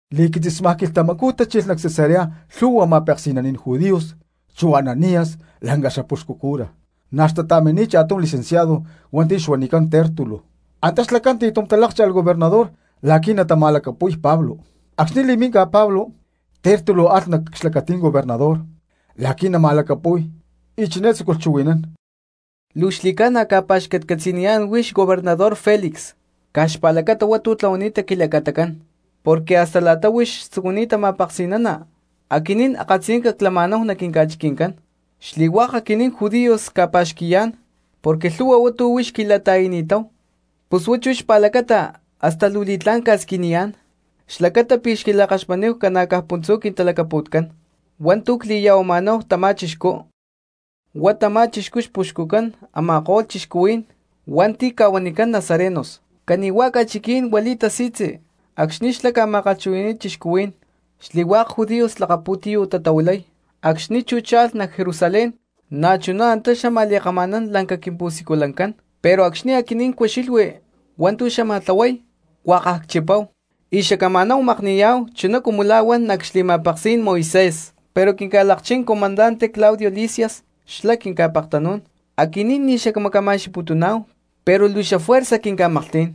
Li̠quitzismá ta̠chilh nac Cesarea lhu̠hua ma̠peksi̠naní̠n judíos chu Ananías lanca xapuxcu cura, na̠ xtata̠mini̠t cha̠tum licenciado hua̠nti̠ xuanicán Tértulo. Antá xlacá̠n ti̠tum talá̠kcha̠lh gobernador la̠qui̠ natama̠lacapu̠y Pablo. Acxni̠ li̠minca Pablo, Tértulo alh nac xlacatí̠n gobernador la̠qui̠ natalacapu̠y y chiné tzúculh chuhui̠nán: —Luu xli̠ca̠na cca̠pa̠xcatcatzi̠niyá̠n huix gobernador Felix caj xpa̠lacata hua̠ntu̠ tlahuani̠ta nac quilacatacán, porque hasta la̠ta huix tzucuni̠ta ma̠peksi̠nana aquinín akatziyanca clama̠náhu nac quinca̠chiqui̠ncán. Xli̠hua̠k aquinín judíos cca̠pa̠xqui̠yá̠n porque lhu̠hua hua̠ntu̠ huix quila̠ta̠i̠ni̠táhu. Pus huá xpa̠lacata chú hasta luu li̠tlá̠n csquiniyá̠n xlacata pi̠ xquila̠kaxmatníhu ca̠na̠caj puntzú quintalacapu̠tcán hua̠ntu̠ cli̠ya̠huama̠náhu tamá chixcú. Huá tamá chixcú xpuxcucán a̠ma̠ko̠lh cristianos hua̠nti̠ ca̠huanicán nazarenos, cani̠hua̠ ca̠chiquí̠n huili̠y tasi̠tzi acxni̠ xlá ca̠ma̠kalhchuhui̠ni̠y cristianos, xli̠hua̠k judíos lakapu̠tiyú̠ tatahuilay. Acxni̠ chú cha̠lh nac Jerusalén na̠chuná antá xámaj li̠kama̠nán lanca quimpu̠siculancán, pero acxni̠ aquinín cucxilhui hua̠ntu̠ xlá xámaj tlahuay huakaj cchipáhu y xacama̠náhu makni̠yá̠hu chuná cumu la̠ huan nac xli̠ma̠peksí̠n Moisés. Pero quinca̠lakchín comandante Claudio Lisias xlá quinca̠pektanú̠n, aquinín ni̠ xacmacama̠xqui̠putuná̠hu pero luu xafuerza quinca̠maklhtí̠n.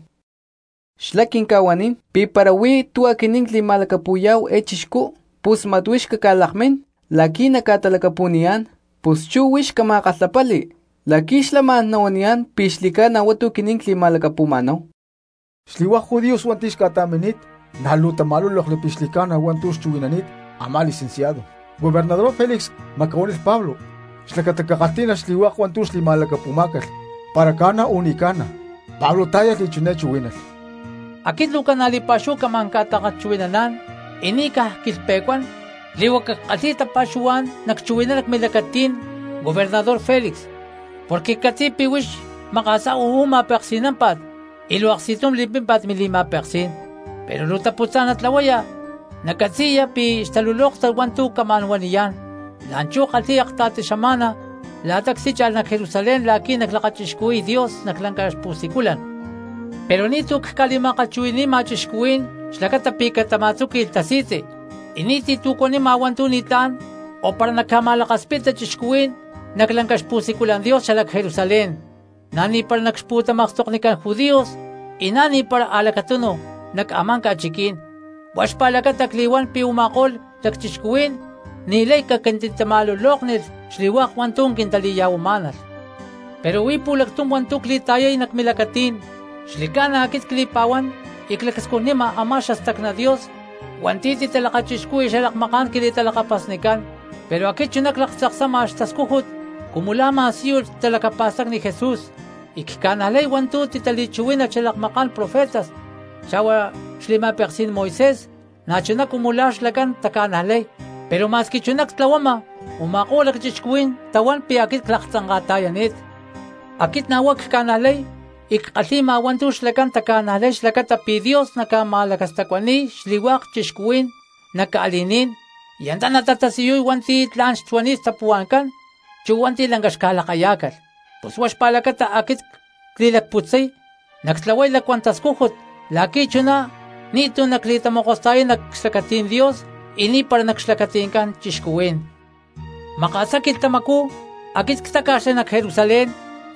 Xlá quinca̠huanín pi̠ para huí tu̠ aquinín cli̠ma̠lacapu̠yá̠hu eé chixcú pus mat huix cacca̠lakmín la̠qui̠ nacca̠talacapu̠niyá̠n. Pus chú huix cama̠kalhapali la̠qui̠ xlá ma̠n nahuaniyá̠n pi̠ xli̠ca̠na hua̠ntu̠ aquinín cli̠ma̠lacapu̠ma̠náhu. Xli̠hua̠k judíos hua̠nti̠ xca̠ta̠mini̠t na̠ luu tama̠lúlokli pi̠ xli̠ca̠na hua̠ntu̠ xchuhui̠nani̠t a̠má licenciado. Gobernador Felix macahuánilh Pablo xlacata cakalhtí̠nalh xli̠hua̠k hua̠ntu̠ xli̠ma̠lacapu̠má̠calh para ca̠na o ni̠ca̠na. Pablo tá̠yalh y chiná chuhuí̠nalh: —Aquit luu ca̠na̠ li̠pa̠xúhu camá̠n ca̠ta̠kalhchuhui̠naná̠n y ni̠ caj cquilhpe̠cuán, li̠huaca ckalhi̠y tapa̠xuhuá̠n nacchuhui̠nán nac milacatí̠n, Gobernador Felix, porque ccatzi̠y pi̠ huix maka̠sá uú ma̠peksi̠námpa̠t y luu aksti̠tum li̠pímpa̠t mili̠ma̠peksí̠n. Pero luu taputzá̠n natlahuaya nacatzi̠ya pi̠ xtalulóktat hua̠ntu̠ camá̠n huaniyá̠n. La̠nchú kalhi̠y aktiy xama̠na la̠ta ctícha̠lh nac Jerusalén la̠qui̠ naclakachixcuhui̠y Dios nac lanca xpu̠siculan. Pero ni̠tu̠ cca̠li̠ma̠kalhchuhui̠ni̠ma cristianos xlacata pi̠ catama̠tzúqui̠lh tasi̠tzi, y ni̠ti̠ tu̠ cuanima hua̠ntu̠ ni̠tlá̠n o para nacca̠ma̠lakaspita cristianos nac lanca xpu̠siculan Dios xalac Jerusalén, na̠ ni̠para nac xpútamakstoknicán judíos, y na̠ ni̠para a̠lacatunu nac a̠má ca̠chiquí̠n. Huá xpa̠lacata cli̠huán pi̠ u̠ma̠ko̠lh lacchixcuhuí̠n ni̠lay caquintitama̠lulóknilh xli̠hua̠k hua̠ntu̠ quintali̠ya̠huamá̠nalh. Pero huí pu̠lactum hua̠ntu̠ cli̠ta̠yay nac milacatí̠n, xli̠ca̠na aquit cli̠pa̠huán y clacscujnima a̠má xastacná Dios hua̠nti̠ titalakachixcúhui̠lh xalakmaká̠n quili̠talakapasnicán, pero aquit chuná claktzaksama xatascújut cumu la̠ ma̠síyulh talacapa̠stacni Jesús, y cca̠najlay hua̠ntu̠ titali̠chuhuí̠nalh xalakmaká̠n profetas xa̠huá xli̠ma̠peksí̠n Moisés na̠chuná cumu la̠ xlacán taca̠najlay, pero ma̠squi chuná ctlahuama u̠ma̠ko̠lh lacchixcuhuí̠n tahuán pi̠ aquit claktzanka̠ta̠yani̠t. Aquit na̠ huá cca̠najlay y ckalhi̠ma hua̠ntu̠ xlacán taca̠najlay xlacata pi̠ Dios naca̠ma̠lacastacuani̠y xli̠hua̠k cristianos nac ca̠li̠ní̠n y antá natatasiyuy hua̠nti̠ tla̠n xuani̠t xtapuhua̠ncán chu hua̠nti̠ lanca xca̠lakayá̠calh. Pus huá xpa̠lacata aquit cli̠lacputzay nactlahuay lacuán tascújut la̠qui̠ chuná ni̠tu̠ nacli̠tamokosta̠yay nac xlacatí̠n Dios y ni̠para nac xlacati̠ncán cristianos. ’Maka̠sá quilhtamacú aquit ctáca̠xli nac Jerusalén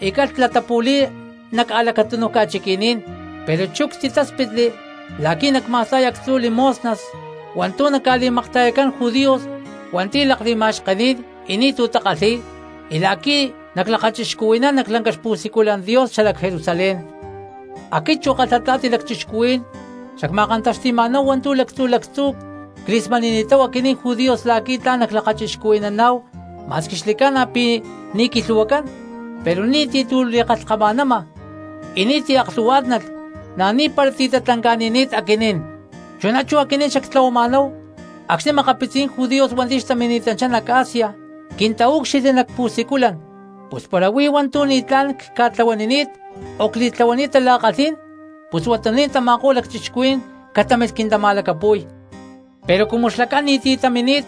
y calh latapu̠li̠y nac a̠lacatúnuj ca̠chiqui̠ní̠n, pero chú ctitáspitli la̠qui̠ nacma̠sta̠y actzu̠ limosnas hua̠ntu̠ naca̠li̠makta̠yacán judíos hua̠nti̠ lakli̠ma̠xkení̠n y ni̠tu̠ takalhi̠y y la̠qui̠ naclakachixcuhui̠nán nac lanca xpu̠siculan Dios xalac Jerusalén. Aquit chu kalhata̠ti lacchixcuhuí̠n xacma̠kantaxti̠ma̠náhu hua̠ntu̠ lactzu̠ lactzú cli̠smani̠ni̠táhu aquinín judíos la̠qui̠ tla̠n naclakachixcuhui̠naná̠hu ma̠squi xli̠ca̠na pi̠ ni̠ quilhu̠huacán, pero ni̠ti̠ tu̠ li̠kalhkama̠nama y ni̠ti̠ aklhu̠huá̠tnalh, na̠ ni̠para ti̠ tatlanca̠ni̠ni̠t aquinín. Chuná chú aquinín xactlahuama̠náhu acxni̠ makapitzí̠n judíos hua̠nti̠ xtamini̠tanchá nac Asia quintaúcxilhli nac pu̠siculan, pus para huí hua̠ntu̠ ni̠tlá̠n cca̠tlahuanini̠t o cli̠tláhualh tala̠kalhí̠n pus huatuní̠n tama̠ko̠lh lacchixcuhuí̠n catámilh quintama̠lacapu̠y. Pero cumu xlacán ni̠ti̠ tamini̠t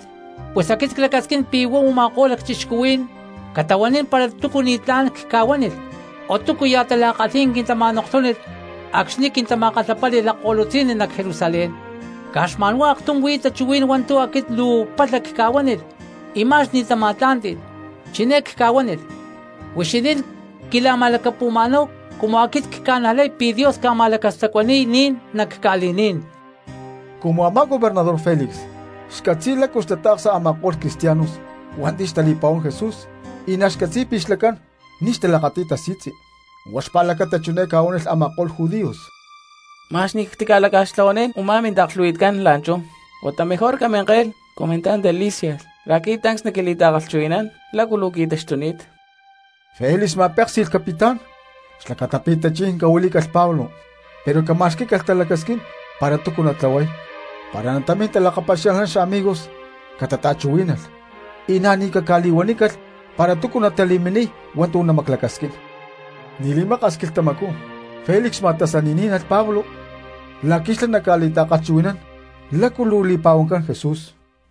pus aquit clacasquín pi̠ huá u̠ma̠ko̠lh lacchixcuhuí̠n catahuanín para túcu ni̠tlá̠n cca̠huánilh o túcuya̠ tala̠kalhí̠n quintama̠lulóknilh acxni̠ quintama̠kalhapáli̠lh lakko̠lutzi̠nni nac Jerusalén. Caj xma̠nhuá aktum huí tachuhuí̠n hua̠ntu̠ aquit luu palha cca̠huánilh y ma̠x ni̠ tama̠tlá̠nti̠lh, chiné cca̠huánilh: “Huixinín quila̠ma̠lacapu̠ma̠náhu cumu aquit cca̠najlay pi̠ Dios naca̠ma̠lacastacuani̠y ni̠n nac ca̠li̠ní̠n.” Cumu a̠má gobernador Felix xcatzi̠y lácu xtatata̠ksa a̠ma̠ko̠lh cristianos hua̠nti̠ xtali̠pa̠huán Jesús y na̠ xcatzi̠y pi̠ xlacán ni̠ xtalakati̠y tasi̠tzi, huá xpa̠lacata chiné ca̠huánilh a̠ma̠ko̠lh judíos: —Ma̠x ni̠ cactica̠laca̠xtlanín u̠má mintaaklhu̠hui̠tcán la̠nchú, huata mejor caminke̠lh comandante Lisias la̠qui̠ tancs naquili̠ta̠kalhchuhui̠nán lácu luu qui̠taxtuni̠t. Felix ma̠péksi̠lh capitán xlacata pi̠ tachí̠n cahuilí̠calh Pablo pero cama̠xquí̠calh talacasquín para túcu natlahuay, para natamín talakapaxia̠lhnán xamigos catata̠chuhuí̠nalh y na̠ ni̠ caca̠li̠huanícalh para tícu natali̠miniy hua̠ntu̠ namaclacasquín. Ni̠ li̠maka̠s quilhtamacú Felix ma̠tasaní̠nalh Pablo la̠qui̠ xlá naca̠li̠ta̠kalhchuhui̠nán lácu luu li̠pa̠huancán Jesús,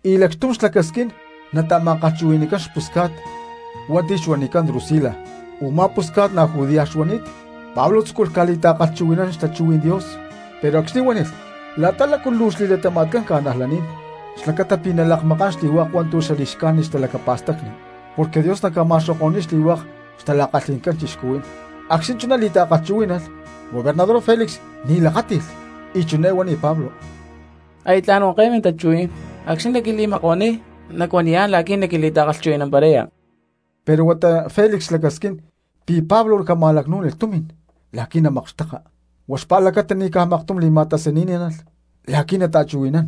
y lacxtum xlacasquín nata̠ma̠kalhchuhui̠ni̠cán xpusca̠t hua̠nti̠ xuanicán Drusila, u̠má pusca̠t na̠ judía xuani̠t. Pablo tzúculh ca̠li̠ta̠kalhchuhui̠nán xtachuhuí̠n Dios pero acxni̠ huánilh la̠ta lácu luu xli̠latama̠tcán cristianos, xlacata pi̠ nalakmakán xli̠hua̠k hua̠ntu̠ li̠xcájnit xtalacapa̠stacni porque Dios naca̠ma̠xoko̠ni̠y xli̠hua̠k xtala̠kalhi̠ncán xli̠hua̠k cristianos, acxni̠ chuná li̠ta̠kalhchuhuí̠nalh, gobernador Felix ni̠ tilakáti̠lh y chiné huánilh Pablo: —Aya tla̠n huanke̠y mintachuhuí̠n, acxni̠ naquili̠makuaniy nacuaniyá̠n la̠qui̠ naquili̠ta̠kalhchuhui̠namparaya. Pero huata Felix xlacasquín pi̠ Pablo cama̠lacnú̠nilh tumi̠n la̠qui̠ namakxteka, huá xpa̠lacata ni̠ caj maktum li̠ma̠tasaní̠nalh la̠qui̠ nata̠chuhui̠nán.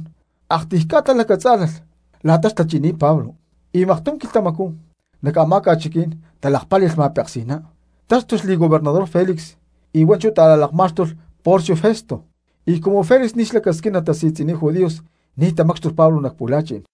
Aktiy ca̠ta lacatzá̠lalh la̠ta xtachi̠ni̠t Pablo, y maktum quilhtamacú nac a̠má ca̠chiquí̠n talakpáli̠lh ma̠peksi̠ná, táxtulh li̠gobernador Felix y hua̠nchú ta̠la̠lakmá̠xtulh Porcio Festo. Y cumu Felix ni̠ xlacasquín natasi̠tzi̠niy judíos ni̠ tamácxtulh Pablo nac pu̠la̠chi̠n.